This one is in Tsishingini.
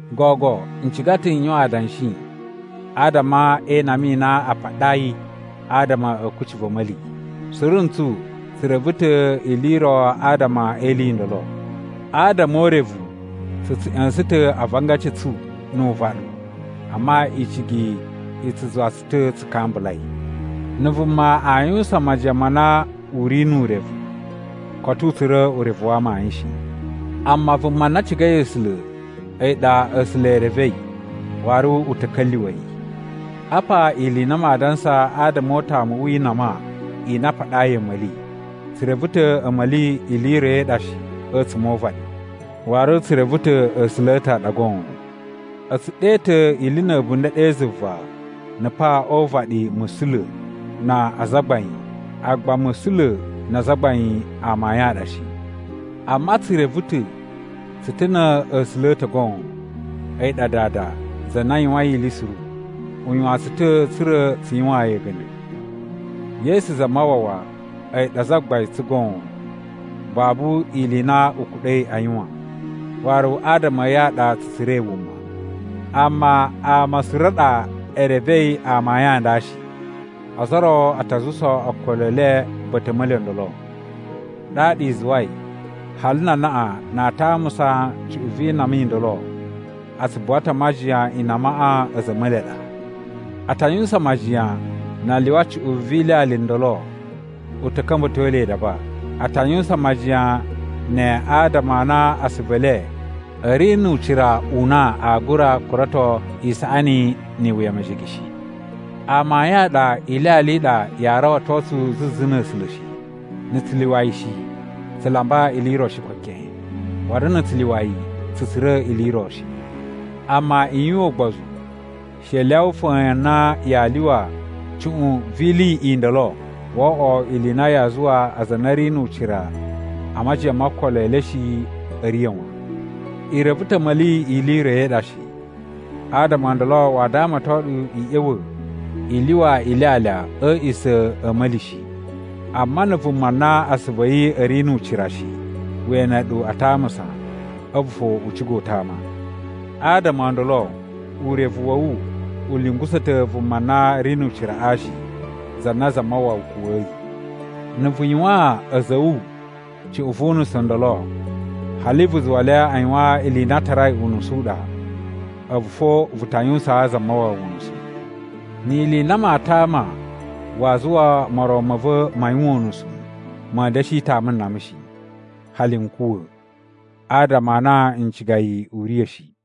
Gogo n ciga ta̱ n yuwan adanshi adama e inama i na ama a paɗai adama a̱ kucci va̱ a̱ma̱li. Suru ntsu tsu reve ta̱ ili i ro adama e ili i ndolo. Adama o urevu tsu tsu ꞌya̱sa̱n ta̱ avangaci a̱ tsu nu uvaɗu, amma icigi i tsu zuwa tsu ta̱ tsu kambulai. Na̱ vuma aa yuwusan majiyan ma na u ri nu urevu, koto u tsura̱ urevu wa amayun shi. Amma vuma na cigai A̱sula̱, a̱yi ɗa A̱sula̱ e revei waru u ta̱ ka̱lyuwa̱ yi. Apa ili i na maa dansa adama o utamu wi inama i na a paɗayi a̱ma̱li: Tsu reve ta̱ a̱ma̱li ili i ro i ɗa shi a̱tsuma̱ o uvaɗi, waru tsu reve ta̱ A̱sula̱ a̱ ta̱ a ɗa goon. A̱ tsu ɗe ta̱ ili na̱ a̱bunda̱ ɗe zuva na̱ pa o uvaɗi “musula̱” na “azagbain” agba “musula̱” na “azagbain” a amayun a ɗa shi. Amma tsu reve ta̱ tsu ta̱ na̱ A̱sula̱ a̱ ta̱ goon, a̱yi ɗa Dada, za na yuwain ili suru, u yuwan tsu ta̱ tsa̱ra̱ tsu yuwaan yi a̱ga̱nda̱. Yesu Zamawawa a̱yi ɗa Zagbain tsu goon. Babu ili i na u kuɗa̱i a yuwan, waru adama a̱ yi a ɗa tsu tsura̱i wuma. Amma ama suru a ɗa e revei amayun a nda shi. Ozo o ro a ta zuwusa okolo e le ba̱ta̱ a̱ a̱ma̱li o ndolo, ɗaɗa i zuwai hali na anaꞌan na aa tamusa cuꞌun vi inama i ndolo, a tsu buwa ta̱ a majiyan inamaꞌa a̱za̱ a̱ a̱ma̱li a ɗa. A ta yuwusan majiyan na a lyuwa cuꞌun vi ilyalya i ndolo u ta̱ ka̱mba̱to le idaba. A ta yuwusan majiyan ne adama a na asuvu e le a̱ ri nu ucira u na aa gura kurato isaꞌani ni iwuya mejege shi. Amayun a ɗa ilyalya i ɗa yaa rawato tsu zuzu na̱ A̱sula̱ shi. Na̱ tsu lyuwa yi shi, tsu lamba ili i ro shi ko keꞌen. Waru na̱ tsu lyuwa yi, tsu tsura̱ ili i ro shi. Amma i yuwan ugbozu. She i lyawa fa̱a̱n na yaa lyuwa cuꞌun vi ili i ndolo wo oꞌwo ili i na yaa zuwa aza a na a̱ ri nu ucira a majiyan mo okolo e le shi a̱ riya̱ wan. I reve ta̱ a̱ma̱li ili i ro i ɗa shi, adama o ndolo waa damaton ɗu i ꞌya̱wa̱ i lyuwa ilyalya a̱ a̱a̱ꞌisa̱ a̱ a̱ma̱li shi. Amma na̱ vuma na asuvu a̱ yi a̱ ri nu ucira shi we ene ɗu a tamusa, a̱vu fo u ciga u tama. Adama o ndolo urevu wa̱ wu u lungusa̱ ta̱ vuma na ri nu uciraꞌa shi za na Zamawawa kuwa̱yi. Na̱ vu yuwaan a̱za̱ a̱ wu cuꞌun vu unusu ndolo, hali vu zuwa le a yuwan ili i na a tarai unusu u ɗa, a̱vu fo vu ta yuwusaan Zamawawa unusu. Ni ili i na maa tama waa zuwa moron ma̱ va̱ ma yuwan unusu, ma̱a̱ da̱shi tama nama shi, hali n kuwa̱, adama a na n ciga yi u riya̱ shi.